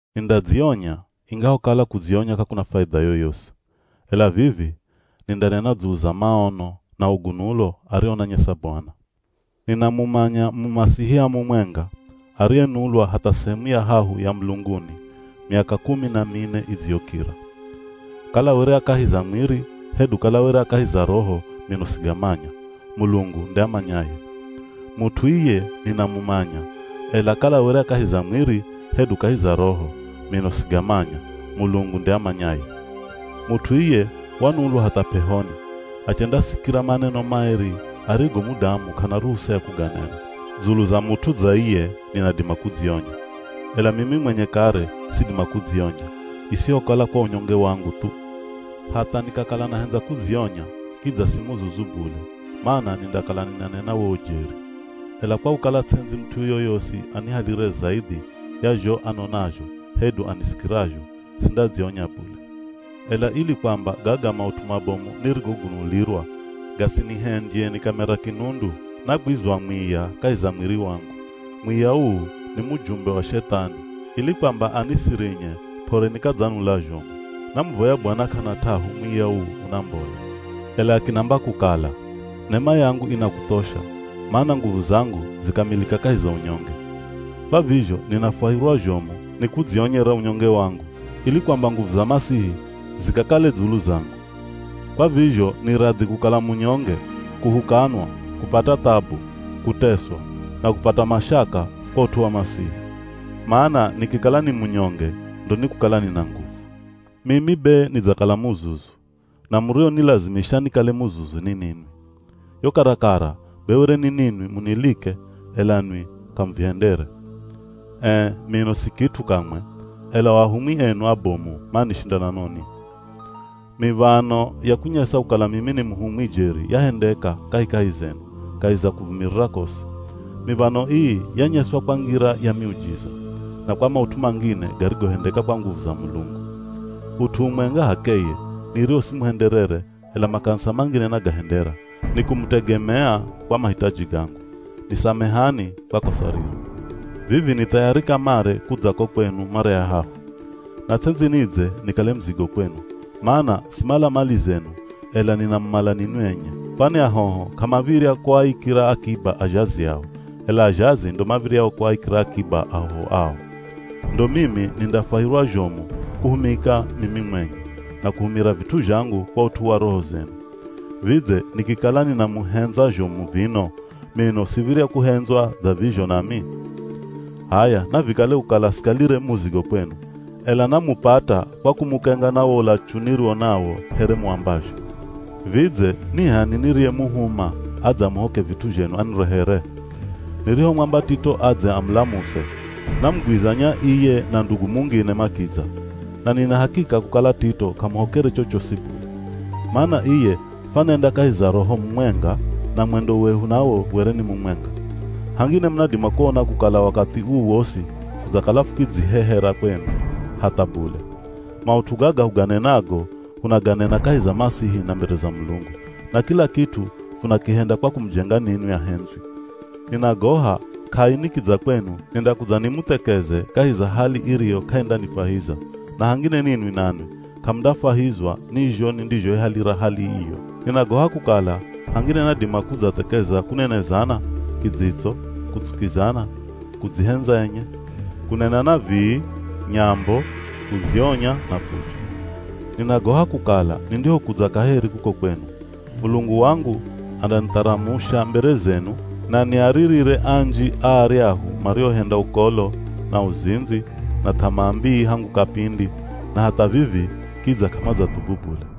Nindadzionya, ingahokala kudzionya k'akuna faidha yoyosi. Ela vivi, nindanena dzulu za maono na ugunulo arionanyesa Bwana. Ninamumanya Mumasihia mumwenga, ariyenulwa hatha sehemu ya hahu ya mulunguni miaka kumi na mine idziyokira. Kala were a kahi za mwiri, hedu kala were a kahi za Roho mino sigamanya, Mulungu nde amanyaye. Mut'u iye ninamumanya, ela kala were a kahi za mwiri hedu kahi za Roho, mino sigamanya, Mulungu nde amanyaye. Mut'u iye wanulwa hatha p'ehoni, achendasikira maneno maeri arigo mudamu k'ana ruhusa ya kuganena. Dzulu za mut'u dza iye ninadima kudzionya. Ela mimi mwenye kare sidima kudzionya, isihokala kwa unyonge wangu thu. Hatha nikakala nahendza kudzionya kidza si muzuzu bule mana nindakala ninanena wo ujeri. Ela kwa kukala ts'endzi mut'u yoyosi anihalire zaidhi ya zho anonazho hedu anisikirazho, sindadzionya bule. Ela ili kwamba gaga maut'u mabomu nirigogunulirwa gasinihendye nikamera kinundu, nagwizwa mwiya kahi za mwiri wangu. Mwiya uu ni mujumbe wa Shethani ili kwamba anisirinye p'ore nikadzanula zhomu. Namuvoya Bwana k'ana t'ahu mwiya uu unambole, ela akinamba kukala, “Nema yangu inakuthosha, mana nguvu zangu zikamilika kahi za unyonge.” Kwa vizho ninafwahirwa zhomu ni kudzionyera unyonge wangu, ili kwamba nguvu za Masihi zikakale dzulu zangu. Kwa vizho ni radhi kukala munyonge, kuhukanwa, kupata thabu, kuteswa, na kupata mashaka kwa ut'u wa Masihi. Mana nikikala ni munyonge ndo nikukala nina nguvu. Mimi be nidzakala muzuzu, na murionilazimisha nikale muzuzu ni ninwi. Yo karakara be were ni ninwi munilike ela nwi k'amuvihendere. Ee mino si kit'u kamwe, ela o ahumwi enu abomu manishinda na noni? Miv̱ano ya kunyesa kukala mimi ni muhumwi jeri yahendeka kahikahi zenu kahi za kuvumirira kosi. Miv̱ano ii yanyeswa kwa ngira ya miujiza, na kwa maut'u mangine garigohendeka kwa nguvu za Mulungu. Ut'u umwenga h'akeye, nirio simuhenderere ela makanisa mangine nagahendera, ni kumutegemea kwa mahitaji gangu. Nisamehani kwa kosa riro. Vivi ni thayari kamare kudza ko kwenu mara ya hahu. Na ts'endzi nidze nikale muzigo kwenu, mana simala mali zenu ela ninamumala ninwi enye. Kwani ahoho k'amav̱irya kuaikira akiba azhazi ao, ela azhazi ndo mav̱iryao kuaikira akiba ahoho ao. Ndo mimi nindafwahirwa zhomu kuhumika mimi mwenye, na kuhumira vit'u zhangu kwa ut'u wa roho zenu. Vidze nikikala ninamuhendza zhomu vino, mino siv̱irya kuhendzwa dza vizho nami? H'aya navikale kukala sikalire muzigo kwenu, ela namupata kwa kumukenga na wo ulachu niriwo nawo here muambazho. Vidze ni h'ani niriyemuhuma adze amuhoke vit'u zhenu anirehere? Nirihomwamba Tito adze amulamuse, namugwizanya iye na ndugu mungine makidza. Na nina hakika kukala Tito k'amuhokere chochosi bule. Mana iye fwanenda kahi za Roho mumwenga, na mwendo wehu nawo were ni mumwenga. Hangine munadima kuona kukala wakathi uu wosi fudzakala fukidzihehera kwenu. Hatha bule! Maut'u gaga huganenago hunaganena kahi za Masihi na mbere za Mulungu. Na kila kit'u funakihenda kwa kumujenga ninwi ahendzwi. Ninagoha k'ai nikidza kwenu nindakudza nimuthekeze kahi za hali iriyo k'aindanifwahiza, na hangine ninwi nanwi k'amundafwahizwa ni zho nindizhoihalira hali iyo. Ninagoha kukala hangine nadima kudzathekeza kunenezana, kidzitso, kutsukizana, kudzihendza enye, kunenana vii, nyambo, kudzionya na fujo. Ninagoha kukala nindihokudza kaheri kuko kwenu, Mulungu wangu andanitharamusha mbere zenu na niaririre anji a aryahu mariohenda ukolo, na uzindzi, na th'amaa mbii hangu kapindi, na hatha vivi kidza k'amadzathubu bule.